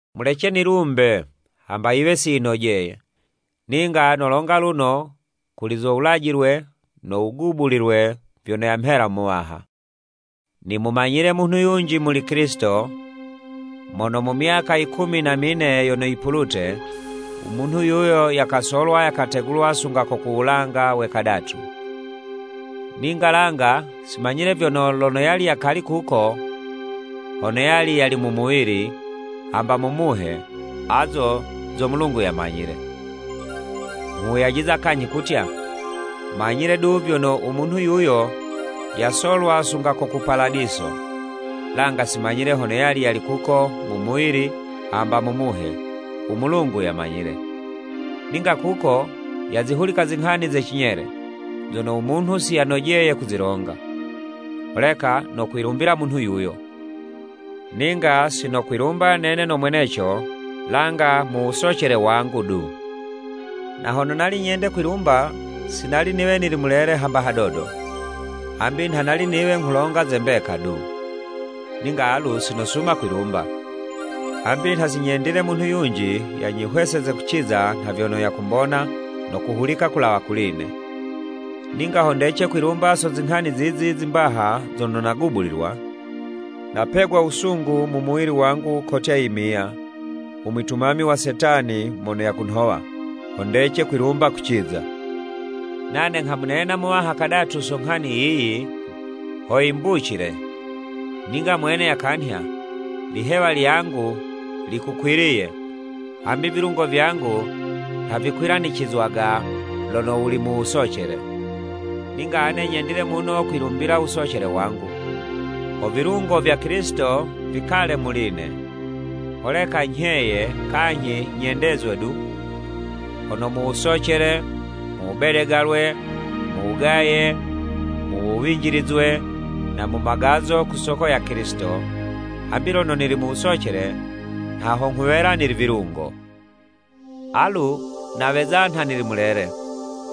Mulece nilumbe, hamba yiwe si yinojeye. Ninga nolonga luno kuli zo wulajilwe no wugubulilwe vyono yamhela Muwaha. Nimumanyile munhu yunji Mukilisito, mono mu myaka i kumi na mine yono yipulute, u munhu yuyo, yakasolwa yakategulwa sunga ko ku wulanga we kadatu. (Ninga langa simanyile vyono, lono yali yali kuko, hono yali yali mu muwili, hamba mu muhe azo zo Mulungu yamanyile.) Nghuwuyajiza kanyhi kutya, manyile du vyono u munhu yuyo, yasolwa sunga ko ku Paladiso. (Langa si manyile hono yali yali kuko mu muwili hamba mu muhe, u Mulungu yamanyile.) Ninga kuko yazihulika zinghani ze cinyele, zono u munhu siyanojeye kuzilonga. Holeka nokwilumbila munhu yuyo, ninga si nokwilumba nene no mweneco, langa mu wusocele wangu du. Na hono nali nyende kwilumba, si nali niwe nili mulele hamba hadodo, hambi nha nali niwe nghulonga ze mbeka du. Ninga alu si nosuma kwilumba, hambi nha sinyendile munhu yunji yanyihweseze kuziza nha vyono yakumbona no kuhulika kulawa kuli'ne. Ninga ho ndece kwilumba so zinghani zizi zimbaha zono nagubulilwa, napegwa wusungu mu muwili wangu kotya yimiya, u mwitumami wa Setani, mono yakunhowa, ho ndece kwilumba kuciza. Nane nghamunena Muwaha kadatu so nghani yiyi, ho yimbucile. Ninga Mwene yakanhya, “Ilihewa lyangu likukwiliye, hambi vilungo vyangu nha vikwilanicizwaga lono wuli mu wusocele.” Ninga ane nyendile muno kwilumbila wusocele wangu, ho vilungo vya Kilisito vikale muli'ne. Holeka nyheye kanyhi nyendezwe du, hono mu wusocele, mu wubedegalwe, mu wugaye, mu wuwinjilizwe, na mu magazo ku soko ya Kilisito, hambi lono nili musocele, nha ho nghuwela nili vilungo. Alu naweza nha nili mulele,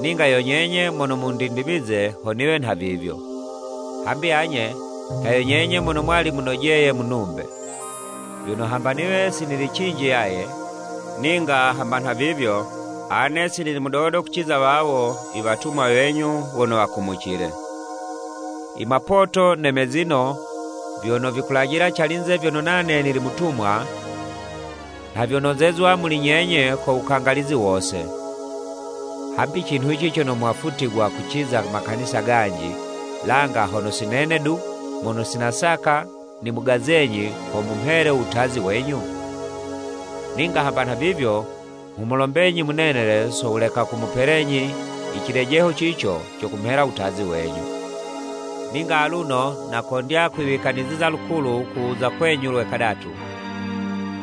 ninga yo nyenye mono mundindimize ho niwe nhavivyo. Hambi anye, nha yo nyenye mono mwali munojeye munumbe. Vyono, hamba niwe si nili cinji yaye, ninga hamba nhavivyo, ane si nili mudodo kuciza wawo i “Watumwa wenyu wono wakumucile.” I mapoto ne mezino vyono vikulajila calinze vyono nane nili mutumwa, nha vyonozezwa muli nyenye ko wukangalizi wose. Hambi cinhuci cono mwafutigwa kuciza makanisa ganji, langa hono si nene du mono si nasaka nimugazenyi ho mumhele u wutazi wenyu? Ninga hamba nhavivyo nghumulombenyi munenele so wuleka kumupelenyi i cilejeho cico co kumhela wutazi wenyu! Ninga aluno nakondya kwiwikaniziza lukulu ku wuza kwenyu lwe kadatu,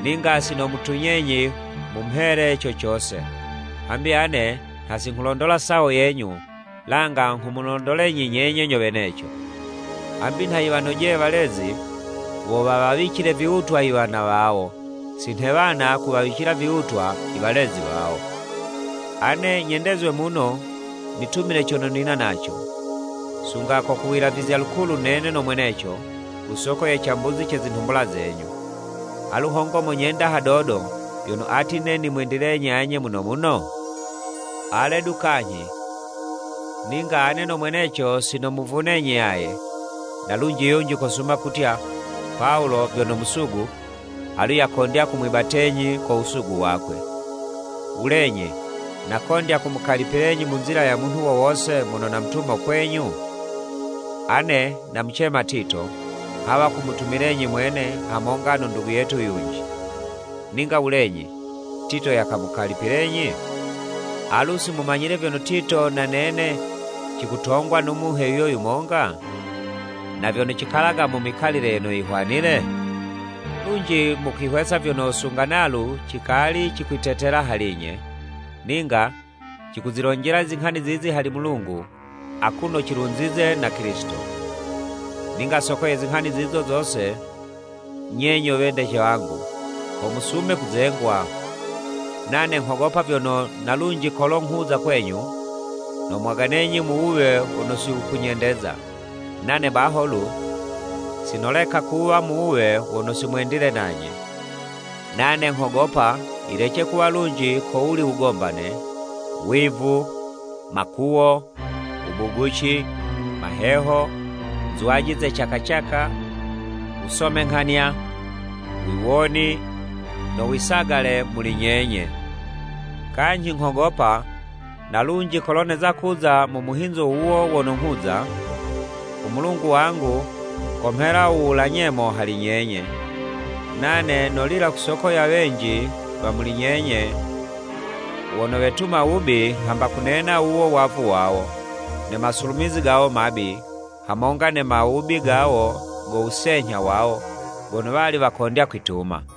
ninga si nomutunyenyi mumhele co cose. Hambi ane nha si nghulondola sawo yenyu langa nghumulondolenyi nyenye nyo weneco. Hambi nha yiwanojeye walezi wo wawawicile viwutwa i wana wawo, si nhe wana kuwawicila viwutwa i walezi wawo. Ane nyendezwe muno nitumile cono nina naco, sunga ko ku wilavizya lukulu nene no mweneco, ku soko ye cambuzi ce zinhumbula zenyu. Alu hongo monyenda hadodo, vyono ati'ne nimwendilenyi anye muno muno? Ale du kanyhi, ninga ane no mweneco si namuvunenyi yaye. Na lunji yunji kosuma kutya, “Pawulo vyono musugu, alu yakondya kumwibatenyi ko wusugu wakwe.” Wulenyi nakondya kumukalipilenyi mu nzila ya munhu wo wose mono namutuma kwenyu? Ane namucema Tito, nghawa kumutumilenyi mwene hamonga no ndugu yetu yunji. Ninga wulenyi, Tito yakamukalipilenyi? Alu si mumanyile vyono Tito na nene cikutongwa no Muhe yuyo yumonga? Na vyono cikalaga mu mikalile yono yihwanile? Lunji mukwihwesa vyono, sunga nalu cikali cikwitetela hali'nye! Ninga cikuzilonjela i zinghani zizi hali Mulungu akuno cilunzize na Kilisito. Ninga soko ye zinghani zizo zose, nye nyo wedece wangu, ho musume kuzengwa. Nane nghogopa vyono na lunji kolo nghuza kwenyu, nomwaganenyi mu wuwe wono si wukunyendeza, nane baho lu, si noleka kuwa mu wuwe wono si mwendile nanye. Nane nghogopa yilece kuwa lunji ko wuli wugombane, wivu, makuwo, wubuguci, maheho, nzwaji ze caka caka, wusomenghanya, wiwoni, no wisagale muli nyenye. Kanyhi nghogopa, na lunji kolo neza kuza mu muhinzo wuwo wono nokuza, u Mulungu wangu komhela u wula nyemo hali nyenye, nane nolila ku soko ya wenji wa muli nyenye wono wetuma wubi hamba kunena wuwo wavu wawo, ne masulumizi gawo mabi, hamonga ne mawubi gawo go wusenyha wawo, gono wali wakondya kwituma.